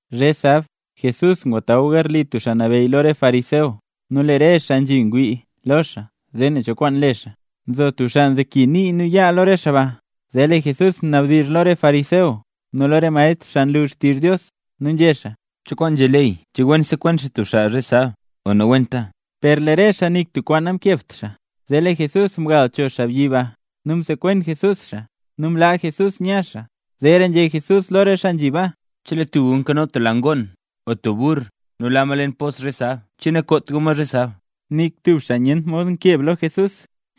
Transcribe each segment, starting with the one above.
Zhe sab, Jesús ngwataw garli tub xaa nabeyy lo re fariseo nu lee re xaa nzhi ngwii lo xaa zee nen cho kwaan le xaa. Nzo tub xaa nzeki nii nu yaa lo re xaa ba. Zee lee Jesús mnabdizh lo re fariseo nu lo re maestr xaa nlu xtizh Dios, nu nzhé xaa: —¿Cho kwaan nzhé ley? ¿Che wen sekwen xaa tub xaa zhe sab o nawenta? Per lee re xaa nik tub kwaan namkebt xaa. Zee lee Jesús mgal cho xaabyi ba nu msekwen Jesús xaa, nu mlaa Jesús nya xaa. Zeera nzhé Jesús lo re xaa nzhi baa: —Chelee tub gu nkano tub la ngoon o tub burr nu la ma leen tub pos zhe sab, ¿che nakoot gu ma zhe sab? Nik tub xaa nyent mod nkeb lo Jesús.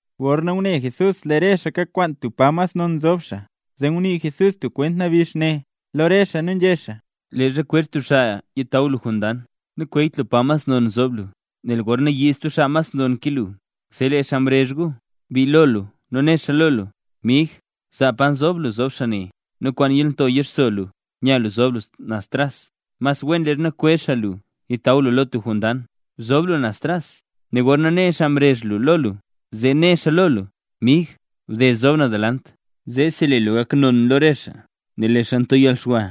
Gorna ngune Jesús lee re xaa kakwaan tub pa mas non zob xaa, zee ngunii Jesús stub kwent nabix ne lo re xaa nu nzhé xaa: —Leezha kwezh tub xaa lu yitaw lu lo tub jondang, nakweeyt lu pa mas non zob lu, nel gorna yiid stub xaa nonra ke lu, zee lee xaa mrezh gu bii lo lu, nu né xaa lo lu: “Mig, zaa pa nzob lu zob xaa ne”. Nu kwaan yalnto yixso lu nu nya lu zob lu axta tras. Mas wen leezha kwezh xaa lu yitaw lu lo tub jondang, bzob lu naz tras, nu gorna ne xaa mrezh lu lo lu, zee né xaa lo lu: “Mig, bded zob naz delant”. Zeesi lee lu gak xaa non lo re xaa. Nel lee xaa nto yalxwa,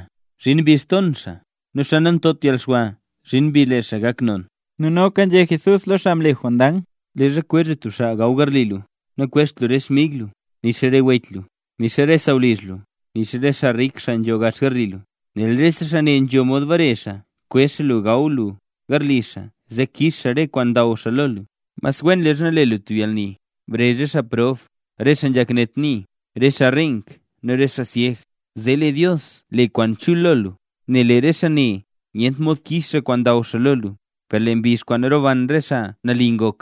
zhin mbizh ton xaa; nu xaa nantot yalxwa, zhin mbizh lee xaa gak non. Nu noka nzhé Jesús lo xaa mle jondang: —Leezha kwezh lu tub xaa gaw garli lu, nakwezht lu re xmig lu, nixa re wech lu, nixa re sawlizh lu, nixa re xaa rik xaa nzho gax garli lu; nel rese xaa ne nzho mod bare xaa kwezh xaa lu gaw lu garli xaa zee kix xaa re kwaan ndaw xaa lo lu. Mas wen leezha le lu tub yalni, brezh re xaa prob, re xaa nzhak net nii, re xaa reenk nu re syeg; zee lee Dios le kwaan chul lo lu, nel lee re xaa ne nyent mod kix xaa kwaan ndaw xaa lo lu, per lee mbizh kwaan roban re xaa nali ngok,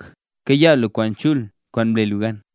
kayaa lu kwaan chul kwaan mle lu gan.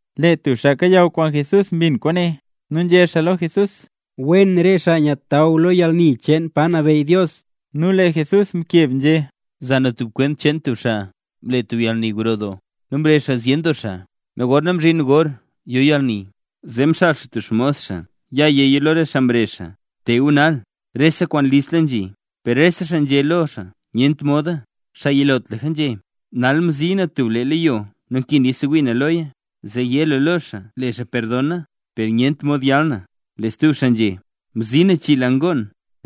Lee tub xaa kayaw kwaan Jesús mbin kwaane, nu nzhé xaa lo Jesús: —Wen re xaa nyataw lo yalni cheen pa nabeyy Dios. Nu lee Jesús mkeb nzhé: —Za na stub kwent cheen tub xaa mle tub yalni gro doo, nu mrezh xaa zyen doo xaa. Nu gorna mzhin gor yo yalni, zee mxaal xaa tub xmos xaa yéya lo re xaa mrezh xaa: “Te gu nal, rese kwaan listla nzhi”. Per rese xaa nzhé lo xaa nyent moda. Xaa yilotlaka nzhé: “Nal mzi na tub lee leyo nu nkin yasewii na loya; zee yé lu lo xaa le xaa perdon na, nel nyent mod yal na”. Lee stub xaa nzhé: “Mzi na chii la ngoon;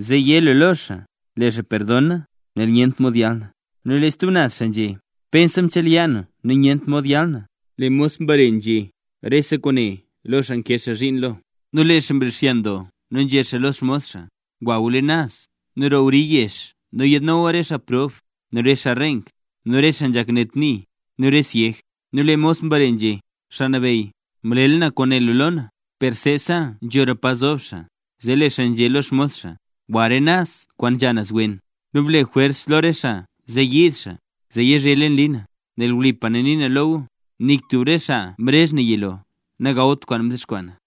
zee yé lu lo xaa le xaa perdon na, nel nyent mod yal na”. Nu lee stub xaa nzhé: “Pensa mchelya na nu nyent mod yal na”. Lee mos mbare nu nzhé rese kwaane lo xaa nkee xaa zhiin lo. Nu lee xaa mrixyan doo nu nzhé xaa lo xmos xaa: “Gwa leen naz nu roo wri yezh nu yaadno lu re xaa prob, nu re xaa reenk, nu re xaa nzhak net nii, nu re syeg”. Nu lee mos mbare nzhé: “Xaa Nabeyy, mlela na kwaan né lu lo na, per seesa nzhora pa zob xaa”. Zee lee xaa nzhé lo xmos xaa: “Gwa re naz kwaan nzha naz wen, nu ble jwers lo re xaa zee yiid xaa, zee yizhe leen li na. Nel wlipa na nii na lo gu, nik tub re xaa mrezh na yilo, nagawt kwaan mdexkwaa na.”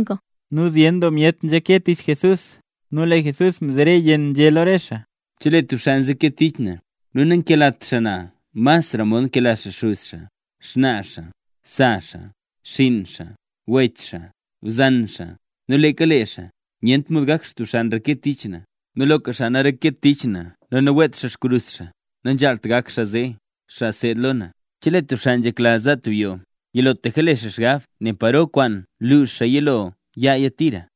Nu zyen doo myet nzhake tich Jesús, nu lee Jesús mzere yenn, nzhé lo re xaa: —Chelee tub xaa nzeke tich na, nu nankelat xaa na masra mod nkela xaa xuz xaa, nu xnaa xaa, nu sa xaa, nu xinn xaa, nu wech xaa, nu bzan xaa, nu leeka lee xaa, nyent mod gak xaa tub xaa nreke tich na. Nu loka xaa nanreket tich na nu naweet xaa xkrus xaa, nanzhaalt gak xaa zee xaa nseed lo na. Chelee tub xaa nzhekla za tub yoo gro, yilotlaka zob xaa le xaa xgab zee nen paro kwaan lux xaa yilo yaaya tira.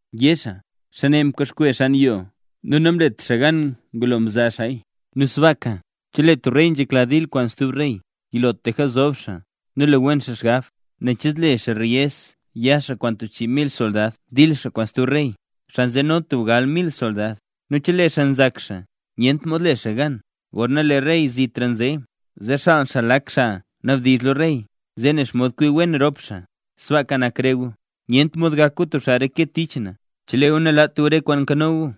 Zee yé re xaa: “Xaabyi ne mbaxkwe xan yoo nu namlet xaa gan ngulo mza xaaya”. Nu sbaaka, chelee tub rey nzhekla dil kwaan stub rey, yilotlaka zob xaa nu le wen xaa xgab, nen che zle xaa reyez ya xaa kwaan tub chii mil soldad dil xaa kwaan stub rey, xaa nzeno tub gal mil soldad. Nu chelee xaa nzak xaa nyent mod le xaa gan, gorna lee rey zitra nze, zee xaal xaa lak xaa nabdizh lo rey, zee nen xomod kwi wen rop xaa. Sbaaka nak re gu, nyent mod gak gu tub xaa reke tich na, chelee gu nalaat gu re kwaan nkano gu.